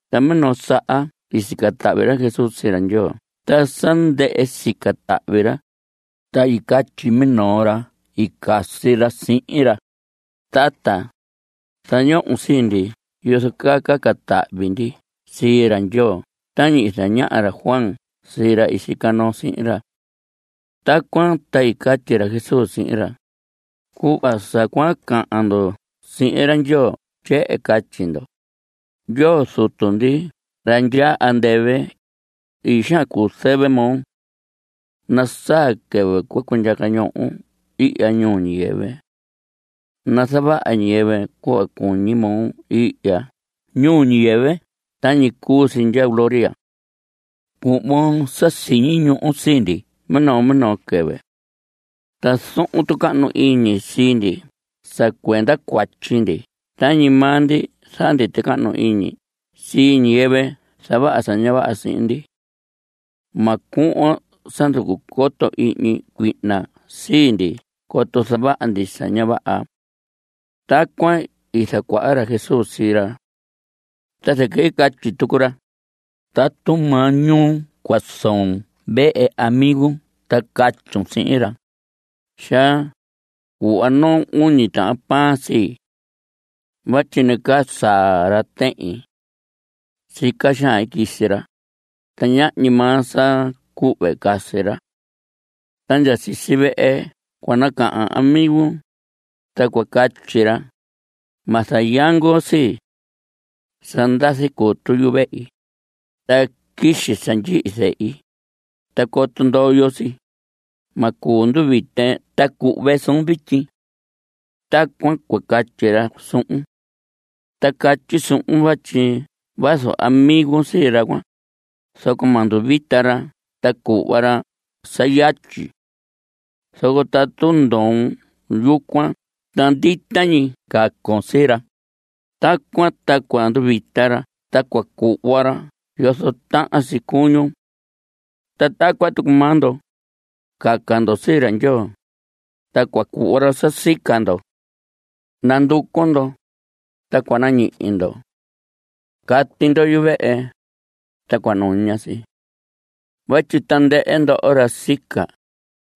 Ta minoo saha sa sica tahvi ra Jesús sii ra Ndyoo ta sa ndɨhɨ sica tahvi ra, ta i catyi minoo ra i casi ra sihin ra: Tata, zañohon sii ndi yozo caa caca tahvi ndi sii ra Ndyoo tañi i zañaha ra Juan sii ra i sica noo sihin ra. Tacuan ta i catyi ra Jesús sihin ra: Cuhva sa cua cahan ndo sihin ra Ndyoo tyehen catyi ndo: “Ndyoo Zutu ndi ra ndyaa andɨvɨ, ii xaan cuu zɨvɨ moo. Nasaa quɨvɨ cua cundyaca ñohon ihya ñuu ñiyɨvɨ. Nazavaha ñiyɨvɨ cuhva cuñi moo ihya ñuu ñiyɨvɨ tañi cuu si ndya gloria. Cuhvon sa siñi ñuhu sii ndi minoo minoo quɨvɨ. Ta zohon tucahnu iñi sii ndi sa cuenda cuatyi ndi tañi maa ndi zaha ndi tucahnu iñi sii ñiyɨvɨ zavaha sa ña vaha sihin ndi. Ma cuhvon sa nducu coto ihñi cuihna sii ndi coto zavaha ndi sa ña vaha.” Tacuan i zacuaha ra Jesús sii ra. Ta zɨquɨ i catyi tucu ra: Tatu maañuu cua soon vehe amigun ta catyun sihin ra: “Xaa, cuhva noo uñi tahan pan sii. Vatyi nacaa saa ra tehin. Sica xaan i quisi ra, ta ñahñi maa sa cuhve casi ra.” Ta ndya sisi vehe cua cahan amigun, ta cua catyi ra: “Ma zayangon sii. Sa ndazi cutu yuvehi. Ta quixi sa ndyihi zehi. Ta coto ndoyo si, ma cuu nduvite ta cuhve suun vityi.” Tacuan cua catyi ra suhun. Ta catyi suhun vatyi vazu amigun sii ra cuan, zoco ma nduvita ra ta cuhva ra sa yatyi. Zoco tatu ndoon yucuan ta ndita ñi cacon sii ra, tacuan ta cua nduvita ra ta cuhva ra yozo tahan si cuñun. Ta tacuan tucu maa ndo. Caca ndo sii ra Ndyoo, ta cua cuhva ra sa sica ndo. Nanducu ndo, ta cua nañihi ndo. Cati ndo yuvehe, ta cua nuña si. Vatyi tandɨhɨ ndoho ra sica,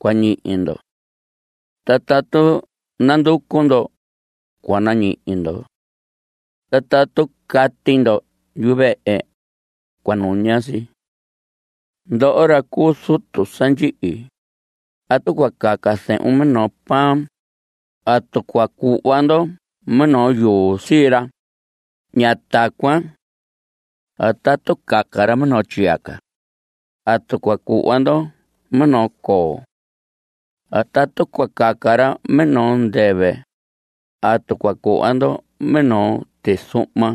cua ñihi ndo. Ta tatu nanducu ndo, cua nañihi ndo. Ta tatu cati ndo yuvehe, cua nuña si. Ndoho, ra cuu zutu sa ndyihi, tatu cua caca zehun minoo pan ¿atu cua cuhva ndo minoo yuu sii ra? Ña tacuan. A tatu caca ra minoo tyiyaca ¿atu cua cuhva ndo minoo coo? A tatu cua caca ra minoo ndɨvɨ ¿atu cua cuhva ndo minoo tizuhma?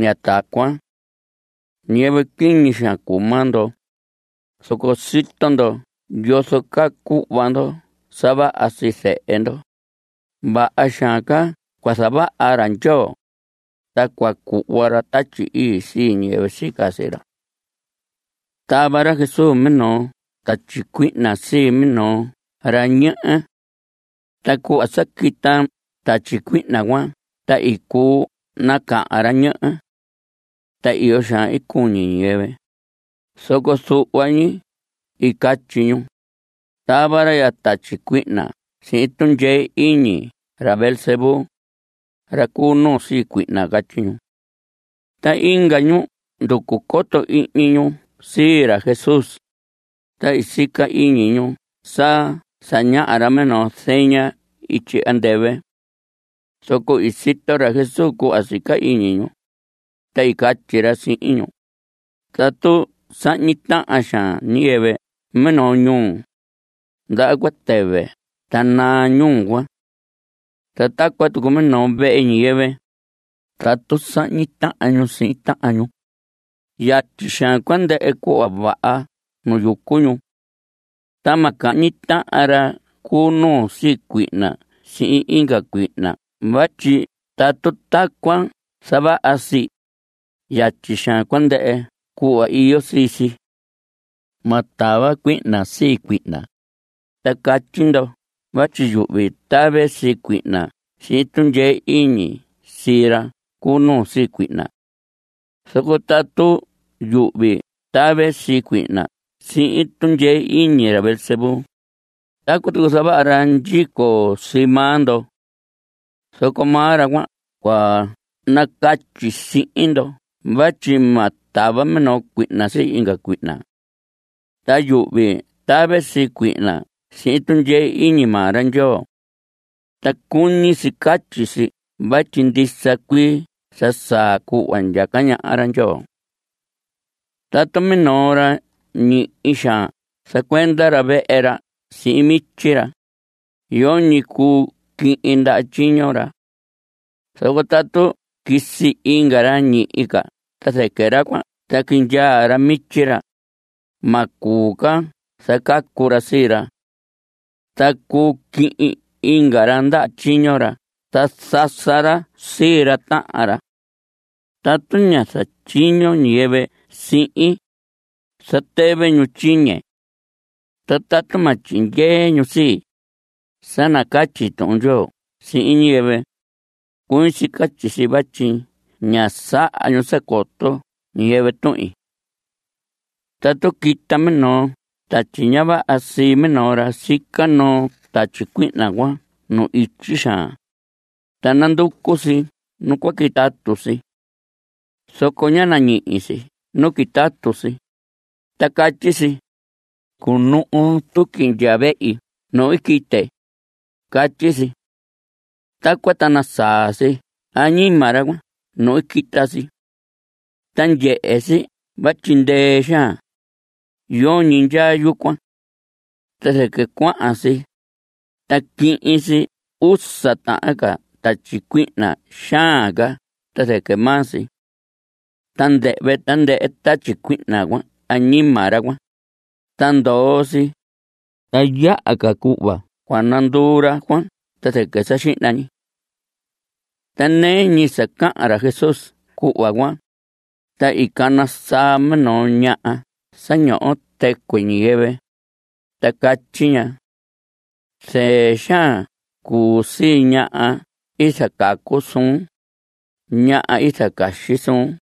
Ña tacuan. Ñiyɨvɨ quiñi xaan cuu maa ndo, zoco sito ndo yozo caa cuhva ndo sa vaha sii zehe ndo; vaha xaan ca cua zavaha ra Ndyoo, ta cua cuhva ra Tatyi Ii sii ñiyɨvɨ sica sii ra. Tava ra Jesús minoo tatyi cuihna sii minoo ra ñehe. Ta cuhva sa quita tatyi cuihna cuan ta i cuu nacahan ra ñehe. Ta iyo xaan i cuñi ñiyɨvɨ. Zoco zuhva ñu i catyi ñu: Tava ra ya tatyi cuihna sihin tundyee iñi ra Beelzebú, ra cu nuu sii cuihna. Catyi ñu. Ta inga ñu nducu coto ihñi ñu sii ra Jesús, ta i sica ñu sa zañaha ra minoo zeña ityi andɨvɨ. Zoco i sito ra Jesús cuhva sica iñi ñu, ta i catyi ra sihin ñu: Tatu sahñi tahan xaan ñiyɨvɨ minoo ñuu, ndaha cua tɨvɨ ta naa ñuu cuan. Ta tacuan tucu minoo vehe ñiyɨvɨ, tatu sahñi tahan ñu sihin tahan ñu, yatyi xaan cua ndɨhɨ cuhva vaha nu yucu ñu. Ta ma cahñi tahan ra cu nuu sii cuihna sihin inga cuihna vatyi tatu tacuan zavaha si, yatyi xaan cua ndɨhɨ cuhva iyo sii si. Ma tava cuihna sii cuihna. Ta catyi ndo vatyi yuhvi tave sii cuihna sihin tundyee iñi sii ra cu nuu sii cuihna. Zoco tatu yuhvi tave sii cuihna sihin tundyee iñi ra Beelzebú, tacuan tucu zavaha ra ndyico sii maa ndo. Zoco maa ra cuan cua nacatyi sihin ndo vatyi ma tava minoo cuihna sii inga cuihna. Ta yuhvi tave sii cuihna sihin tundyee iñi maa ra Ndyoo. Ta cuñi si catyi si vatyi ndisa cuii sa saa cuhva ndyaca ñaha ra Ndyoo. Tatu minoo ra ñihi xaan zacuenda ra vehe ra sihin mityi ra, yoñi cuu quihin ndaha tyiño ra. Zoco tatu quisi inga ra ñihi ca ta zɨquɨ ra cuan ta quindyaa ra mityi ra, ma cuu ca zacacu ra sii ra. Ta cuu quihin inga ra ndaha tyiño ra ta zasa ra sii ra tahan ra. Tatu ña zatyiño ñiyɨvɨ sihin, zatɨvɨ ñu tyiñe. Ta tatu ma tyindyee ñu sii, sa nacatyi Tuhun Ndyoo sihin ñiyɨvɨ, cuñi si catyi si vatyi ña saha ñu sa coto ñiyɨvɨ tuhin. Tatu quita minoo tatyi ña vaha sii minoo ra, sica noo tatyi cuihna cuan nu ityi xaan, ta nanducu si nu cua quitatu si. Zoco ña nañihi si nu quitatu si, ta catyi si: “Cunuhu tuqui ndya vehi nu i quite”, catyi si. Tacuan ta nasaa si añima ra cuan nu i quita si. Ta ndyehe si vatyi ndɨɨ xaan; yoñi ndyaa yucuan. Ta zɨquɨ cuahan si, ta quihin si usa tahan ca tatyi cuihna xaan ca ta zɨquɨ maa si. Ta ndɨhvɨ tandɨhɨ tatyi cuihna cuan añima ra cuan, ta ndoo si. Ta yaha ca cuhva cua nanduu ra cuan ta zɨquɨ sa xihna ñi. Ta nɨɨ ñi sa cahan ra Jesús cuhva cuan, ta i cana saa minoo ñaha sa ñoho tɨcuɨ ñiyɨvɨ, ta catyi ña: Zɨɨ xaan cuu sii ñaha i zacacu suun, ñaha i zacaxi suun.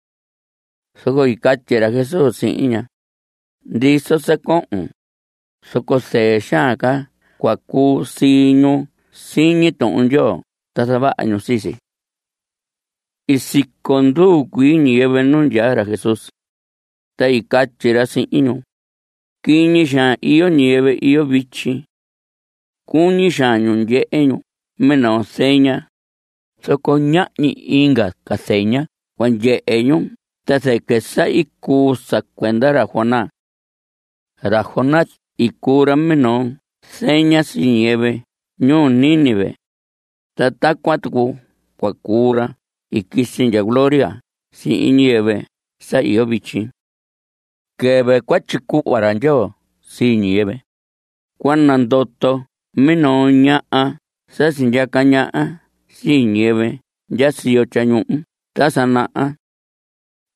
Zoco i catyi ra Jesús sihin ña: Ndison sa cohon, zoco zɨɨ xaan ca cua cuu sii ñu siñi Tuhun Ndyoo ta zavaha ñu sii si. I siconduu cuii ñiyɨvɨ nu ndyaa ra Jesús, ta i catyi ra sihin ñu: Quiñi xaan iyo ñiyɨvɨ iyo vityi. Cuñi xaan ñu ndyehe ñu minoo zeña, zoco ñahñi inga ca zeña cua ndyehe ñu ta zɨquɨ sa i cuu sa cuenda ra Jonás. Ra Jonás i cuu ra minoo zeña sii ñiyɨvɨ ñuu Nínive, ta tacuan tucu cua cuu ra i quisi ndya gloria sihin ñiyɨvɨ sa iyo vityi. Quɨvɨ cua tyicuhva ra Ndyoo sii ñiyɨvɨ, cua nandoto minoo ñaha sa sindyaca ñaha sii ñiyɨvɨ ndya siyo tyañuhu ta sa naha.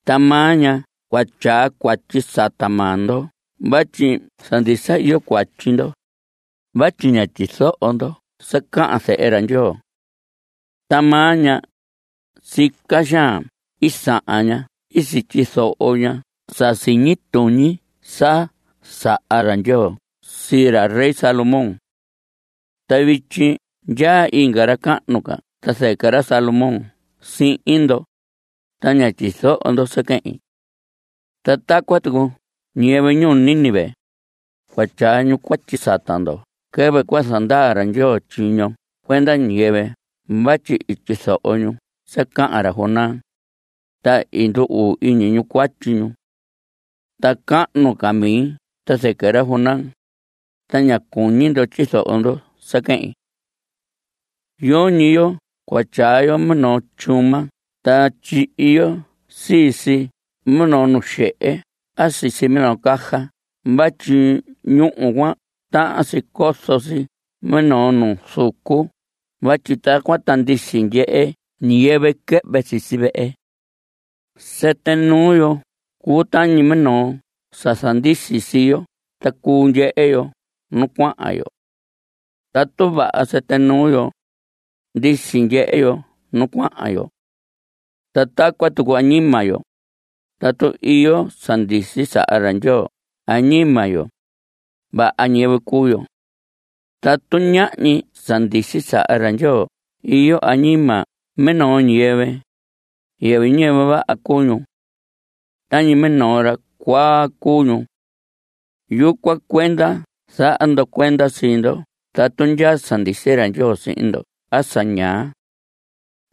Ta maa ña cua tyaa cuatyi sata maa ndo vatyi sa ndisa iyo cuatyi ndo, vatyi ña tyizoho ndo sa cahan Zehe ra Ndyoo. Ta maa ña, sica xaan i sahan ña i sityizoho ña sa siñi tuñi sa saha ra Ndyoo sii ra rey Salomón. Ta vityi ndyaa inga ra cahnu ca ta zɨquɨ ra Salomón sihin ndo, ta ña tyizoho ndo sa quehin. Ta tacuan tucu ñiyɨvɨ ñuu Nínive, cua tyaa ñu cuatyi sata ndo quɨvɨ cua zandaa ra Ndyoo tyiño cuenda ñiyɨvɨ vatyi i tyizoho ñu sa cahan ra Jonás, ta i ndu‑uu iñi ñu cuatyi ñu. Ta cahnu ca mi ta zɨquɨ ra Jonás, ta ña cuñi ndo tyizoho ndo sa quehin. Yoñi yo cua tyaa yo minoo tyuma ta tyihi yo sii si minoo nu xehe a sisi minoo caja vatyi ñúhu cuan tahan si cozo si minoo nu zucu vatyi tacuan ta ndisi ndyehe ñiyɨvɨ quɨhvɨ sisi vehe. Sɨtɨ nuu yo cuu tañi minoo sa zandisi sii yo ta cuu ndyehe yo nu cuahan yo. Tatu vaha sɨtɨ nuu yo, ndisi ndyehe yo nu cuahan yo. Ta tacuan tucu añima yo, tatu iyo sa ndisi sa saha ra Ndyoo añima yo, vaha ñiyɨvɨ cuu yo. Tatu ñahñi sa ndisi sa saha ra Ndyoo iyo añima minoo ñiyɨvɨ, yɨvɨ ñiyɨvɨ vaha cuu ñu. Tañi minoo ra cuaa cuu ñu. Yucuan cuenda zaha ndo cuenda sii ndo tatu ndyaa sa ndisi ra Ndyoo sihin ndo a sa ñaa.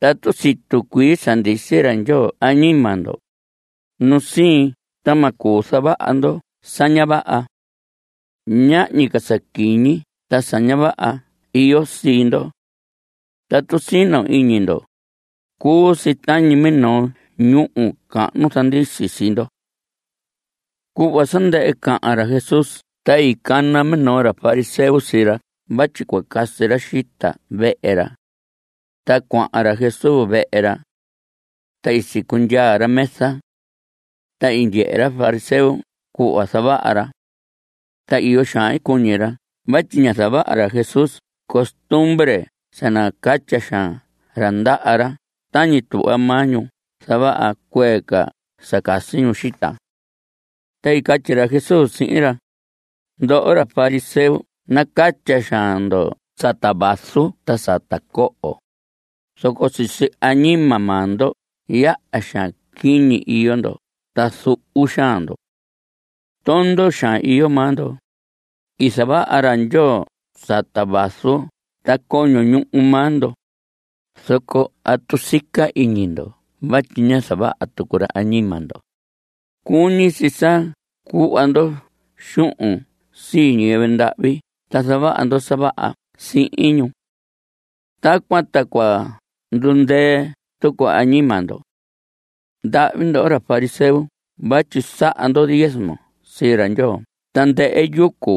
Tatu situ cuii sa ndisi ra Ndyoo añima ndo, nu siin ta ma cuu zavaha ndo sa ña vaha. Ñahñi ca sa quiñi ta sa ña vaha iyo sii ndo. Tatu sino iñi ndo, cuu si tañi minoo ñúhu cahnu zandisi sii ndo. Cuhva sa ndɨhɨ cahan ra Jesús ta i cana minoo ra fariseo sii ra vatyi cua casi ra xita vehe ra. Ta cuahan ra Jesús vehe ra. Ta i sicundyaa ra mesa. Ta i ndyehe ra fariseo cuhva zavaha ra. Ta iyo xaan i cuñi ra vatyi ña zavaha ra Jesús costumbre sa nacatya xaan ra ndaha ra tañi tuhva maa ñu zavaha cuee ca sa casi ñu xita. Ta i catyi ra Jesús sihin ra: Ndoho ra fariseo nacatya xaan ndo sata vaso ta sata coho, zoco sisi añima maa ndo yaha xaan quiñi iyo ndo ta zuhu xaan ndo. Tondo xaan iyo maa ndo. I zavaha ra Ndyoo sata vaso ta coño ñuhu maa ndo, zoco ¿atu sica iñi ndo vatyi ña zavaha tucu ra añima ndo? Cuñi si sa cuhva ndo xuhun sii ñiyɨvɨ ndahvi ta zavaha ndo sa vaha sihin ñu. Tacuan ta cua ndundɨɨ tucu añima ndo. Ndahvi ndoho ra fariseo vatyi saha ndo diezmo sii ra Ndyoo tandɨhɨ yucu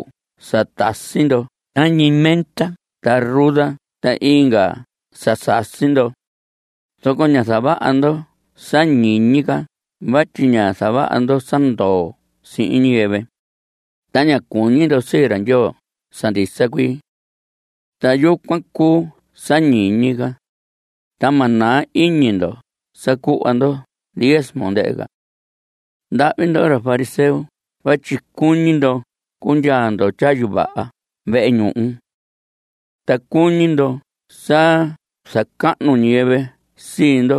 sa tasi ndo tañi menta ta ruda ta inga sa sasi ndo, zoco ña zavaha ndo sa ñiñi ca vatyi ña zavaha ndo sa ndoo sihin ñiyɨvɨ, ta ña cuñi ndo sii ra Ndyoo sa ndisa cuii. Ta yucuan cuu sa ñiñi ca, ta ma naa iñi ndo sa cuhva ndo diezmo, ndɨhɨ ca. Ndahvi ndoho ra fariseo vatyi cuñi ndo cundyaa ndo tyayu vaha vehe ñuhu. Ta cuñi ndo sa zacahnu ñiyɨvɨ sii ndo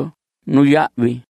nuyahvi.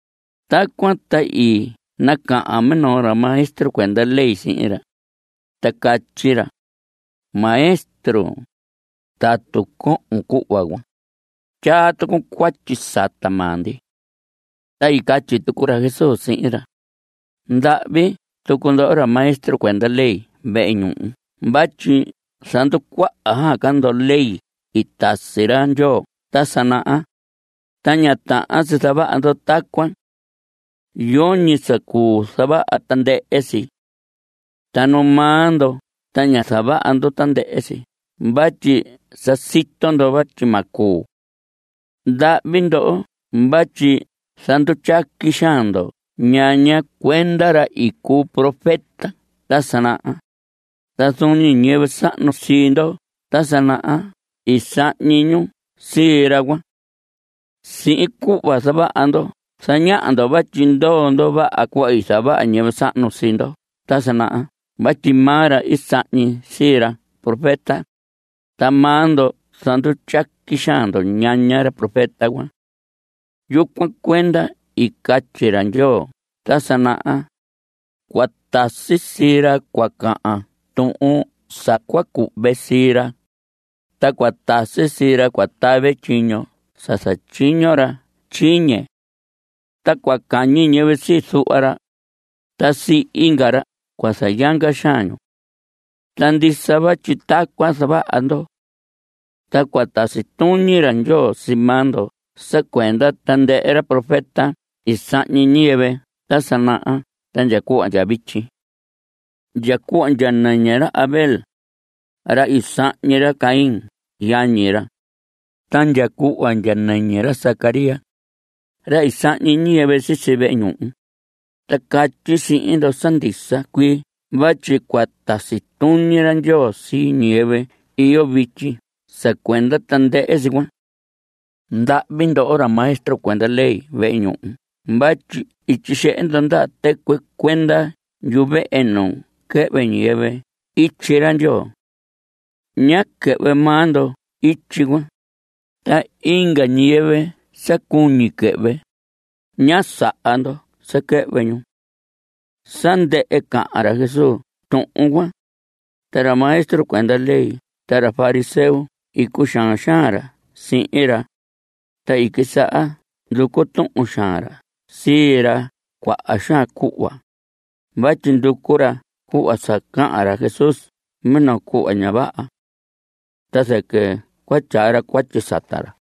Tacuan ta i nacahan minoo ra maestro cuenda ley sihin ra, ta catyi ra: Maestro, tatu cohon cuhva cuan, tyaa tucun cuatyi sata maa ndi. Ta i catyi tucu ra Jesús sihin ra: Ndahvi tucu ndoho ra maestro cuenda ley vehe ñuhu vatyi zanducuaha ca ndo ley i tasi ra Ndyoo ta sa naha, ta ña tahan si zavaha ndo tacuan. Yoñi sa cuu zavaha tandɨhɨ si. Ta nu maa ndo ta ña zavaha ndo tandɨhɨ si vatyi sa sito ndo vatyi ma cuu. Ndahvi ndoho vatyi zandutyaqui xaan ndo ñaña cuenda ra i cuu profeta ta sa naha, ta zuun ñi ñiyɨvɨ sahnu sii ndo ta sa naha i sahñi ñu sii ra cuan. Sihin cuhva zavaha ndo zañaha ndo vatyi ndoo ndo vaha cuhva i zavaha ñiyɨvɨ sahnu sii ndo ta sa naha vatyi maa ra i sahñi sii ra profeta, ta maa ndo zandutyaqui xaan ndo ñaña ra profeta cuan. Yucuan cuenda i catyi ra Ndyoo ta sa naha: Cua tasi sii ra cua cahan tuhun sa cua cuhve sii ra, ta cua tasi sii ra cua tave tyiño sa zatyiño ra tyiñe. Ta cua cahñi ñiyɨvɨ sii zuhva ra, ta sii inga ra cua zayanga xaan ñu. Ta ndisa vatyi tacuan zavaha ndo. Ta cua tasi tuñi ra Ndyoo sii maa ndo sa cuenda tandɨhɨ ra profeta i sahñi ñiyɨvɨ ta sa naha ta ndya cuhva ndya vityi. Ndya cuhva ndya ñɨñɨ ra Abel, ra i sahñi ra Caín yañi ra, ta ndya cuhva ndya nɨñɨ ra Zacarías, ra i sahñi ñiyɨvɨ sisi vehe ñuhu, ta catyi sihin ndo sa ndisa cuii vatyi cua tasi tuñi ra Ndyoo sii ñiyɨvɨ iyo vityi sa cuenda tandɨhɨ si cuan. Ndahvi ndoho ra maestro cuenda ley vehe ñuhu vatyi i tyixehe ndo ndaha tɨcuɨ cuenda yuvehe nu quɨhvɨ ñiyɨvɨ ityi ra Ndyoo. Ñá quɨhvɨ maa ndo ityi cuan, ta inga ñiyɨvɨ sa cuñi quɨhvɨ, ña saha ndo sa quɨhvɨ ñu. Sa ndɨhɨ cahan ra Jesús tuhun cuan, ta ra maestro cuenda ley ta ra fariseo i cuxaan xaan ra sihin ra, ta i quisaha nducu tuhun xaan ra sii ra cuaha xaan cuhva vatyi nducu ra cuhva sa cahan ra Jesús minoo cuhva ña vaha. Ta zɨquɨ cua tyaa ra cuatyi sata ra.